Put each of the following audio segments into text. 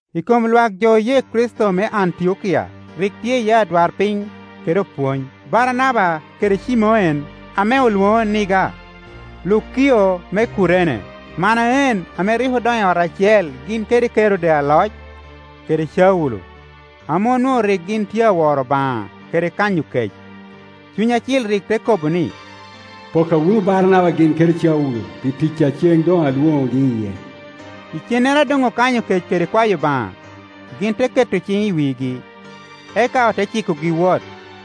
I kom lwak jo oye Kricito me Antiokia rik tye iye odwarpiny kede opwony: Baranaba kede Cimoen ame olwoŋo Niga, Lukio me Kurene, Manaen ame rik odono i ot acel gin kede Kerode aloc, kede Caulo. Ame onwoŋo rik gin tye aworo Obaŋa kede kanyo kec, Cuny Acil rik te kobo ni, “Pokka wunu Baranaba gin kede Caulo pi tic a ceŋ doŋ alwoŋogi iye.” Icennere a doŋ okanyo kec kede kwayo Obaŋa, gin te keto ciŋ i wigi, eka ote cikogi wot.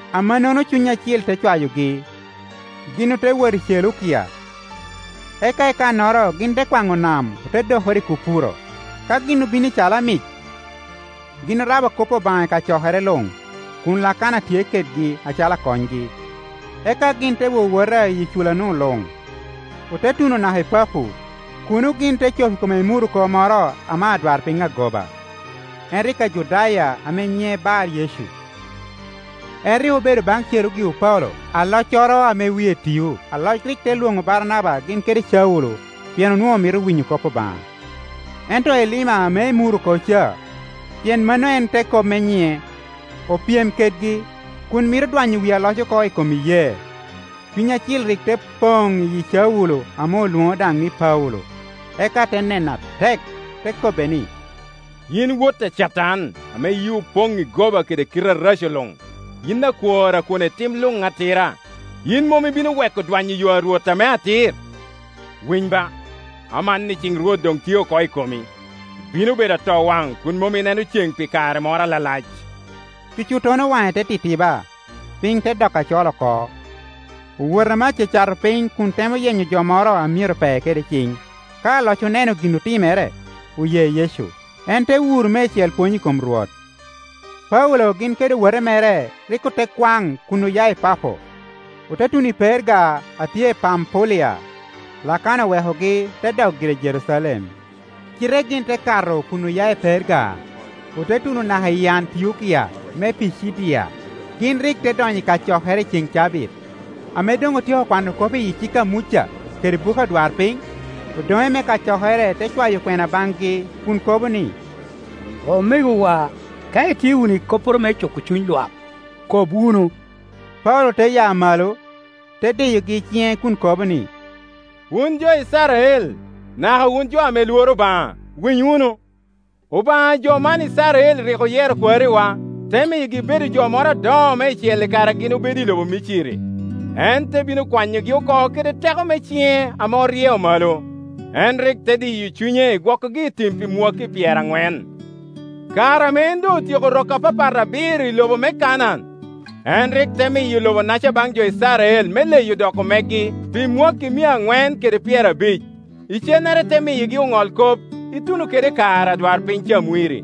Amannono Cuny Acil te cwayogi, gin ote wot i Celeukia, eka i kannoro gin te kwaŋo nam ote dokoro i Kupuro. Ka gin obino i Calamic, gin orabo kop Obaŋa i kacokere luŋ, kun Lakana tye kedgi acalo akonygi. Eka gin te wowota iyi cula-nu luŋ, ote tuno naka i Papo; kuno gin te cop i kom emuroko moro ame adwarpiny agoba, en rik Ajudaya ame nyiŋe Bar-Yecu. En rik obedo baŋ Cerugio Paulo, aloccoro ame wie tio. Aloc rik te lwoŋo Baranaba gin kede Caulo, pien onwoŋo mito winyo kop Obaŋa. Ento Elima ame emuroko ca (pien mano en te kop me nyiŋe) opyem kedgi, kun mito dwanyo wi aloc oko i kom iyee. Cuny Acil rik te poŋ i yi Caulo ame olwoŋo daŋ ni Paulo, eka te nene atek, te kobbe ni, “Yin wot a Catan, ame yii Opoŋ i goba kede kite areco luŋ, yin akwor a kwone tim luŋ atira. Yin mom ibino weko dwanyo yo a Rwot ame atir? Winy ba, amanni ciŋ Rwot doŋ tye oko i komi, ibino bedo atowaŋ kun mom ineno ceŋ pi kare moro alalac.” Cucuttono waŋe te titiba, piny te dokke acol oko, owoto ame acacato piny kun temo yenyo jo moro a myero pee kede ciŋ. Ka aloc oneno gin otimere, oye Yecu. En te wuro meicel pwony i kom Rwot. Paulo gin kede owote mere rik ote kwaŋ kun oya i Papo, ote tuno i Perga a tye i Pampulia. Lakana owekogi te dok gire i Jerucalem. Cite gin te kato kun oya i Perga, ote tuno naka i Antiokia me Picidia. Gin rik te donyo i kacokere i cen cabit. Ame doŋ otyeko kwano kop i cik a Muca kede bu ke odwarpiny, odoŋe me kacokere te cwayo kwena baŋgi kun kobo ni, “Omegowa, ka itye wunu i kopporo me cuko cuny lwak, kob wunu.” Paulo te ya malo, te diyogi i ciŋe kun kobo ni, “Wun jo Icrael, naka wun jo ame lworo Obaŋa, winy wunu. Obaŋa a jo man Icrael rik oyero kwariwa, te miyogi bedo jo moro adoŋo meicel i kare a gin obedo i lobo Miciri. En te bino kwanyogi oko kede teko me ciŋe ame oryeo malo. En rik te diyo cunye i gwokogi i tim pi mwakki pyeraŋwen. Kare ame en doŋ otyeko rok apapat abiro i lobo me Kanaan, en rik te miyo lobo-naca baŋ jo Icrael me leyo doko megi pi mwakki mia aŋwen kede pyerabic. Cam. 3.20Icennere te miyogi oŋolkop ituno kede i kare adwarpiny Camwiri.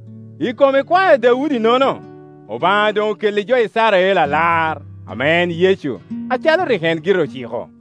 I kom ikwae a Daudi-nono, Obaŋa doŋ okelli jo Icrael Alar, ame en Yecu, acalo rik en gire ociko.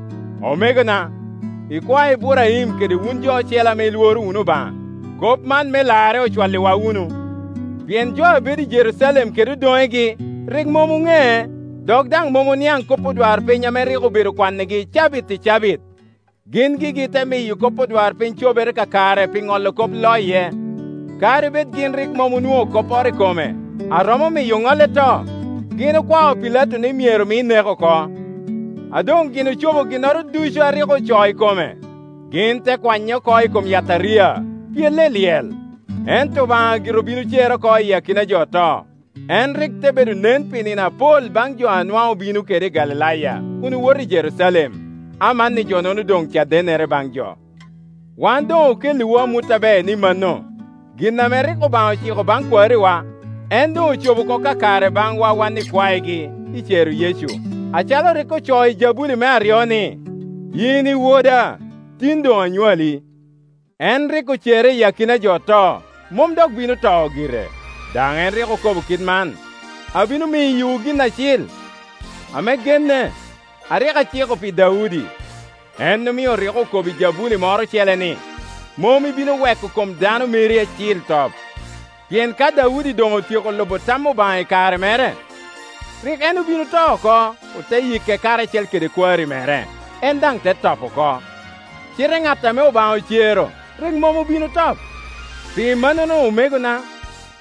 “Omegona, ikwae Iburaim kede wun jo ocele ame ilworo wunu Obaŋa, kop man me larre ocwalliwa wunu. Pien jo a bedo i Jerucalem kede odoŋegi, rik mom oŋee, dok daŋ mom oniaŋ kop odwarpiny ame rik obedo kwannigi cabit i cabit. Gin gigi te miyo kop odwarpiny cobere kakare pi ŋolo kop loye. Kadi bed gin rik mom onwoŋo kopporo i kome a romo miyo oŋolle to, gin okwao Pilato ni myero mi nek oko. A doŋ gin ocobo ginnoro ducu a rik ocoo i kome, gin te kwanye oko i kom yataria, pyele i lyel. Ento Obaŋa gire obin ocere oko iyi akina a jo oto. En rik te bedo nen pi nino apol baŋ jo a nwaŋ obino kede i Galilaya kun owoto i Jerucalem; amanni jo-nono doŋ cadennere baŋ jo. Wan doŋ okelliwu amut aber ni mano, gin ame rik Obaŋa ociko baŋ kwariwa, en doŋ ocobo oko kakare baŋwa wan ikwaegi, i cero Yecu, acalo rik ocoo i abuli me aryo ni, ‘Yin i Woda; tin doŋ anywali.’ En rik ocere iyi akina a jo oto, mom dok bino top gire, daŋ rik en okobo kit man: ‘Abino miyowu gin acil, ame genne, a rik aciko pi Daudi.’ En omio rik okobo i jabuli moro ocele ni, ‘Mom ibino weko kom Dano meri Acil top.’ Pien ka Daudi doŋotyeko lubo tam Obaŋa i kare mere, rik en obin oto oko, ote yike karacel kede kwari mere, en daŋ te top oko. Cite ŋat ame Obaŋa ocero rik mom obin otop. Pi mannono omegona,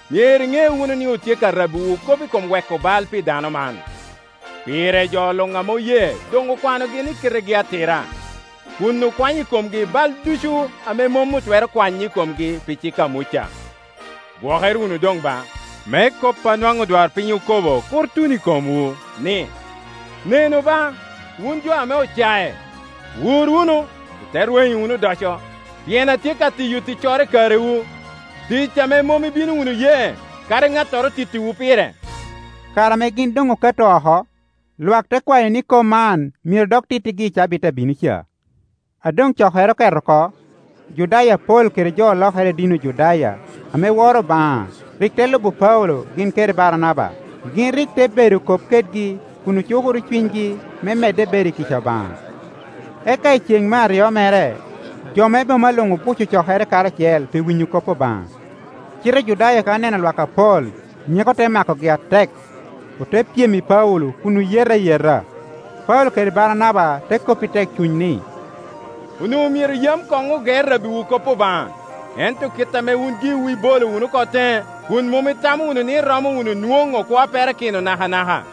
myero iŋe wunu ni otye ka rabbiwu kop i kom weko bal pi dano man. Pire, jo luŋ ame oye doŋ okwanogi ni kitegi atira, kun okwanyo i komgi bal ducu ame mom otwero kwanyo i komgi pi cik a Muca. Gwokere wunu doŋ ba, me kop a nwaŋ odwarpiny okobo kur tun i komwu, ni, ‘Nenu ba, wun jo ame ocae! Wur wunu, ite rwenyo wunu odoco; pien atye ka tiyo ticcoro i karewu, tic ame mom ibino wunu ye, kadi ŋattoro tittiwu pire.’” Kare ame gin doŋ okato oko, lwak te kwayo ni kop man myero dok tittigi i cabit a bino ca. A doŋ cokere oket oko, Ojudaya apol kede jo olokere i dini Ojudaya ame woro Obaŋa rik te lubo Paulo gin kede Baranaba; gin rik te bedo kop kedgi kun oeukuro cunygi me medde bedo i kica Obaŋa. Eka i ceŋ me aryo mere, jo me boma luŋ obuco cokere karacel pi winyo kop Obaŋa. Cite Ojudaya ka oneno lwak apol, nyeko te makogi atek, ote pyem i Paulo kun oyete ayeta. Paulo kede Baranaba te kop i tekcuny ni, “Onwoŋo myero yam koŋ oge rabbiwu kop Obaŋa. Ento kit ame wun giwu ibolo wunu oko teŋe, kun mom itamo wunu ni iromo wunu nwoŋo kwo a perakino nakanaka,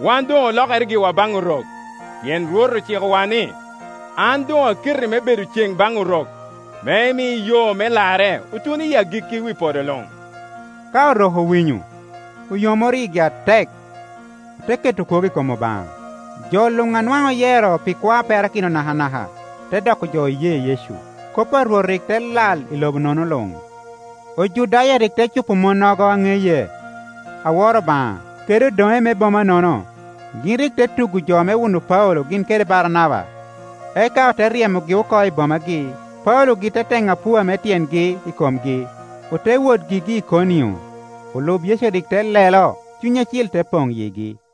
wan doŋ olokere giwa baŋ Orok. Pien Rwot ocikowa ni: ‘An doŋ aketi me bedo cen baŋ Orok, me imi yo me larre otun i agikki wi podo luŋ.’” Ka Orok owinyo, oyomoro yigi atek, ote keto kwogo i kop Obaŋa. Jo luŋ a nwaŋ oyero pi kwo a perakino nakana ka te doko jo oye Yecu. Kop a Rwot rik te lal i lobo-nono luŋ. Ojudaya rik te cupo monnogo a ŋeye, a woro Obaŋa, kede odoŋe me boma-nono; gin rik te tugo jo me wuno Paulo gin kede Baranaba, eka ote ryemogi oko i bomagi. Paulo-gi te teŋo apua me tyengi i komgi, ote wot gigi i Ikonio. Olub Yecu rik te lelo, Cuny Acil te poŋ i yigi.